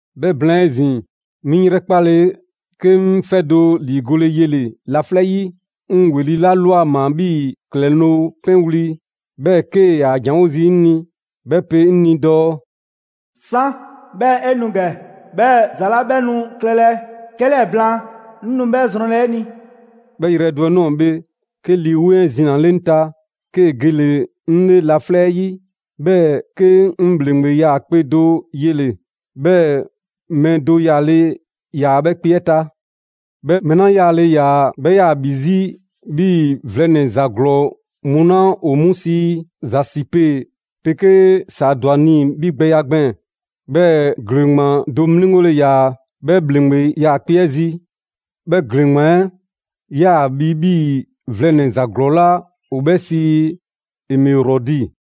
'Bhɛ blaan 'ezin‑, 'mi 'ŋ 'yrɛkpale 'ke 'ŋ 'fɛ do ‑liigole yele‑ laflɛ' 'yi. 'Ŋ ‑weli' 'la ꞊lwa ꞊maa 'bhii‑ ‑klɛloŋ' 'pɛnwli‑, 'bhɛɛ‑ 'kee‑ ‑yaa ‑janwo' zii' 'ŋ ni, 'bhɛ pe 'ŋ ni dɔɔ: «'San, 'bhɛɛ‑ 'e nu ‑gɛ, 'bhɛɛ‑ ‑za 'la 'bhɛ nu klɛlɛ 'kɛlɛɛ‑ blaan, 'ŋ nu 'bhɛ zrɔnlɛ 'e ni.» 'Bhɛ yrɛ do 'ɛ ꞊nɔɔ bhe, 'ke Lii 'Weŋ 'ɛ zinale 'ŋ ta, 'kee‑ gele‑ 'ŋ 'le laflɛ' 'ɛ 'yi, 'bhɛɛ‑ 'ke 'ŋ ‑bhleŋgbe 'yaakpe‑ do yele‑. 'Bhɛɛ‑ mɛɛ do yaale ‑yaa 'bhɛ kpe 'ɛ ta. 'Bhɛ mɛɛ 'la 'yaale‑ ‑yaa, 'bhɛ ‑yaa ‑bhi 'zi 'bhii‑ vlɛnɛ‑ ‑za ‑glɔɔ mu 'la ‑o 'mu sii zasipe 'pegee saadwani 'bhigbɛya gbɛɛn‑. 'Bhɛɛ‑ ‑gleŋgbaan do 'mliŋgole ‑yaa 'bhɛ ‑bhleŋgbe 'yaakpe‑ 'ɛ zi. 'Bhɛ ‑gleŋgbaan 'ɛ 'yaa‑ bhi 'bhii‑ vlɛnɛ‑ ‑za ‑glɔɔ 'la ‑o 'bhɛ sii emerɔdi.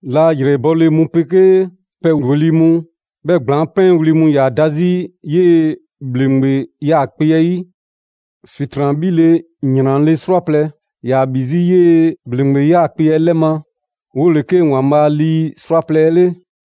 La ‑yrɛbɔle mu 'pegee pɛ ‑weli' mu, 'bhɛɛ‑ ‑gblaŋ' 'pɛɛ wli mu ‑yaa da 'zi 'yee‑ ‑bhleŋgbe 'yaakpe‑ 'ɛ 'yi. ‑Fitran 'bhile‑ ‑yranle' 'srwaplɛ‑ ‑yaa ‑bhi 'zi 'yee‑ ‑bhleŋgbe 'yaakpe‑ 'ɛ 'lɛ ma: 'wole‑ 'ke ‑Waanbhaa' lii 'srwaplɛ‑ 'ɛ 'le.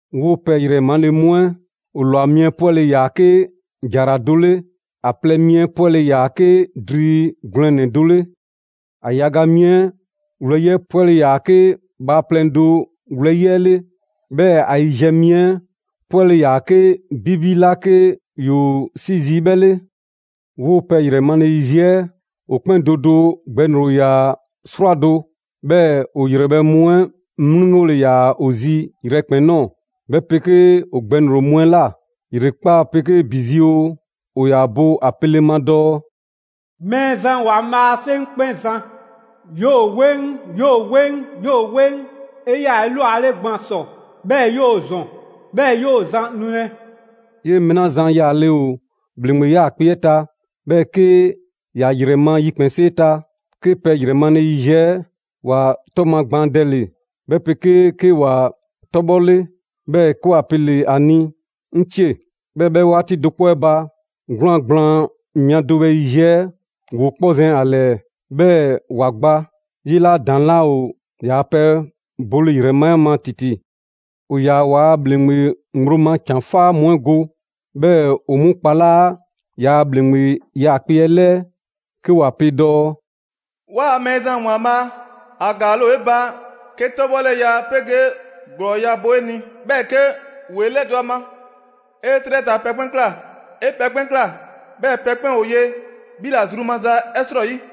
'Woo‑ pɛ ‑yrɛ male mu 'ɛ, ‑o ‑lwa mi 'ɛ 'pwɛle‑ ‑yaa 'ke ‑jara do 'le; ‑a plɛ mi 'ɛ 'pwɛle‑ ‑yaa 'ke dri gwlɛnnɛ‑ do 'le; ‑a yaga mi 'ɛ wlɛyi' 'ɛ 'pwɛle ‑yaa 'ke bhaaplɛŋ do wlɛyi' 'ɛ 'le; 'bhɛɛ‑ ‑a yiziɛ mi 'ɛ 'pwɛle‑ ‑yaa 'ke 'bibi 'la 'ke ‑yoo 'si zii' 'bhɛ 'le. 'Woo‑ pɛ ‑yrɛ male yiziɛ 'ɛ, ‑o 'kpɛn do do gbɛŋroŋ‑ ‑yaa 'srwado‑; 'bhɛɛ‑ ‑o ‑yrɛbhɛ' mu 'ɛ 'mliŋgole ‑yaa ‑o zi yrɛkpɛn‑ ꞊nɔɔ, 'bhɛ 'pegee ‑o gbɛŋroŋ‑ mu 'ɛ ꞊la. ‑Yrekpaa' 'pegee ‑bi zi oo, ‑o ‑yaa bo ‑a pele ma dɔɔ: «Mɛɛzan ‑Waanbhaa' 'Seŋkpɛnzan, ‑yoo 'weŋ, ‑yoo 'weŋ, ‑yoo 'weŋ. 'E 'yaa‑ 'elwale gban ‑sɔ, 'bhɛɛ‑ ‑yoo ‑zɔn, 'bhɛɛ‑ ‑yoo zan nulɛ!» 'Yee‑ mɛɛ 'la zan yaale ‑o ‑bhleŋgbe 'yaakpe‑ 'ɛ ta, 'bhɛɛ‑ 'ke ‑ya ‑yrɛ ma yikpɛnsee ta, 'ke pɛ yrɛ male yiziɛ 'ɛ ‑wa 'tɔ magbaandɛle, 'bhɛ 'pegee 'ke ‑wa 'tɔbhɔle, 'bhɛɛ‑ 'ke ‑wa pele ‑a ni «'Ŋcie!» 'Bhɛɛ‑ 'bhɛ 'waati do 'kpɔ 'ɛ ba, 'gwlaan‑ gblaan mia do bhɛ yiziɛ 'ɛ ‑woo 'kpɔ zɛn ‑a ‑lɛɛ, 'bhɛɛ‑ ‑wa gba; 'yee‑ 'la ‑daŋ' 'laa ‑o ‑yaa pɛ bole ‑yrɛ ma 'ɛ ma ‑titi. ‑O ‑yaa ‑waa' ‑bhleŋgbe ŋgblo ma ‑can 'faa mu 'ɛ go, 'bhɛɛ‑ ‑o 'mu kpalaa' ‑yaa' ‑bhleŋgbe 'yaakpe‑ 'ɛ 'lɛɛ, 'ke ‑wa pe dɔɔ: «'Waa‑ Mɛɛzan ‑Waanbhaa', ‑a ‑gaale' ‑o 'e ba 'ke 'tɔbhɔleya 'pegee ‑glɔɔya' bo 'e ni, 'bhɛɛ‑ 'ke 'woo 'e 'lɛdɔ‑ ‑a ma. 'E 'trɛ ta pɛ 'kpɛn ꞊kla. 'E pɛ 'kpɛn ꞊kla, 'bhɛɛ‑ pɛ 'kpɛn ‑o ye 'bhi ‑la zru maza 'ɛ 'srɔyi.»